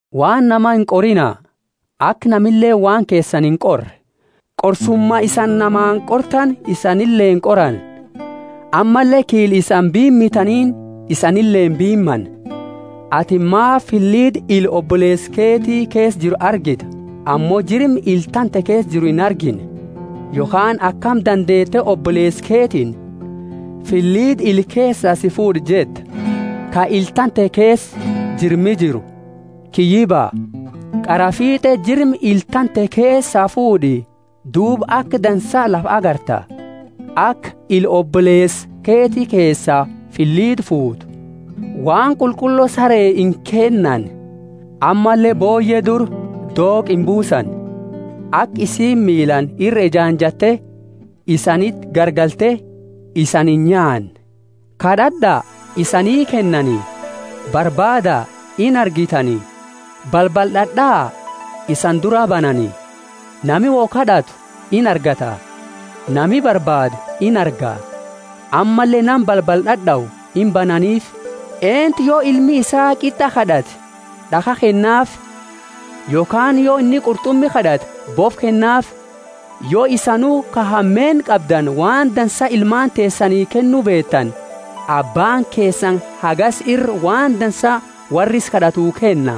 Waan nama inqorina, aka namileeni waan keesani inqorre; qorsuma isani namaani qortani isanile qorani; ammalle kiila isani biimitaniini isanile biimani. Atini maafi filida ila oboleesa keti keesa jiru argita ammo jirma ila tante keesa jiru inargine? Yokhaani akami dandeete oboleesa keetiini, Filida ila keesaa si fuud'a jetta, ka ila tante keesa jirmi jiru? Kiyyiba! Qaraa fiit'e jirma ila tante keesaa fuud'i, duuba aka dansaa lafa agarta, aka ila oboleesa keti keesaa filida fuutu. Waan qulqullo saree inkennani; ammalle booyye dura dooqa imbuusina, aka isiini miilaani ira ejaanjatte isaniti garagalte isani inyaanne. Kad'ad'a, isanii kennani; barbaada, inargitani; balbala d'ad'aa, isani duraa banani. Nami wo kad'atu inargata, nami barbaadu inarga, ammalle nama balbala d'ad'au imbananiifi. Eentu yo ilmi isaa qit'a kad'ate d'akha kennaafi? Yokhaani yo inni qurt'umi kad'ate bofa kennaafi? Yo isanu ka hameenna qabdani, waan dansa ilmaani teesani kennu beetani, Abbaani keesani hagasi ira waan dansa worra isa kad'atu kenna!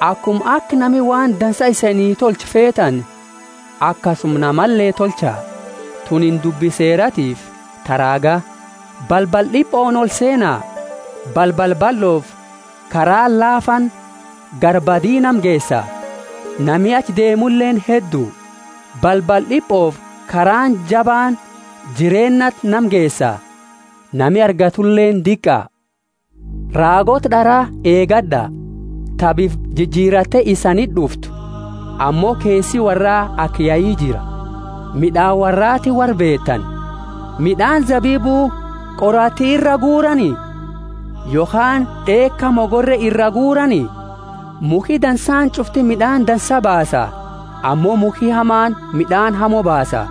Akuma aka nami waan dansa isani tolchu feetani, akasuma namale tolcha; tunini dubbi Seeratiifi ta raaga. Balbala d'ipooni olseena. Balbala ballofi karaani laafaani gara badi nama geesa, nami achi deemuleeni heddu. Balbala d'ipofi karaani jabaani jireennati nama geesa, nami argatuleeni diqa. Raagoota d'ara eegad'a, ta bifa jijiratte isaniti d'uftu, ammo keesi worraa aka yai jira. Mid'aani worraatiini worra beetani. Mid'aani zabibu qoraati iraa guurani? Yokhaani d'eeka mogorre iraa guurani: Mukhi dansaani ch'ufti mid'aani dansa baasa, ammo mukhi hamaani mid'aani hamo baasa.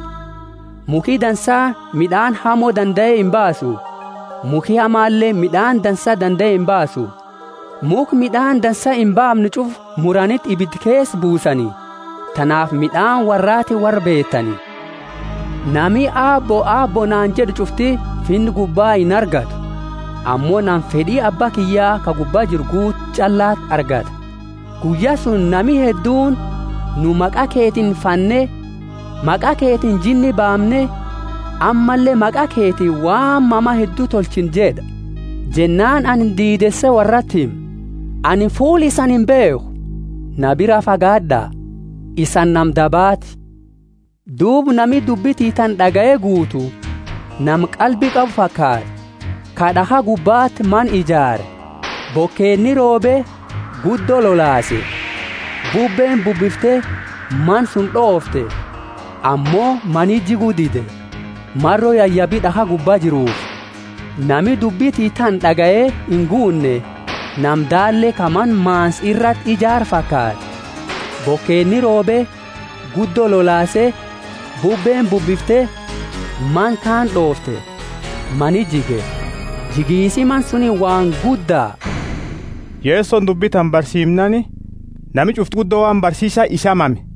Mukhi dansaani mid'aani hamo dandae imbaasu; mukhi hamaleeni mid'aani dansa dandae imbaasu. Mukha mid'aani dansa imbaamne ch'ufa muraniti ibida keesa buusani. Tanaafi mid'aani worraatiini worra beetani. Nami Aabbo, Aabbo, naani jed'u ch'ufti Finna gubba inargattu, ammo nama fed'i Abba kiyya ka gubba jiru guutu ch'allati argata. Guyya suni nami hedduuni, Nu maqa keetiini fanne, maqa keetiini jinni baamne, ammalle maqa keetiini waan mama heddu tolchine jed'a. Jennaani anini diideese worrati hima, anini fuula isani imbeekhu; na biraa fagaad'a, isani nama dabaati. Duuba, nami dubbi tiyya tana d'agaye guutu nama qalbi qabu fakaata, ka d'akha gubbati mana ijaare. Bokeeni roobe, guddo lolaase, bubbeeni bubbifte mana suni d'oofte. Ammo mani jigu dide, maro yayabi d'akha gubba jiruufi. Nami dubbi tiyya tana d'agaye inguunne nama daalle ka mana maansa irati ijaare fakaata. Bokeeni roobe, guddo lolaase, bubbeeni bubbifte mana kaani d'oofte, mani jige. Jigisi mana suni waan gudda! Yesoni dubbi tana barsiimnaani, nami ch'ufti guddo waan barsiisa isaa mame.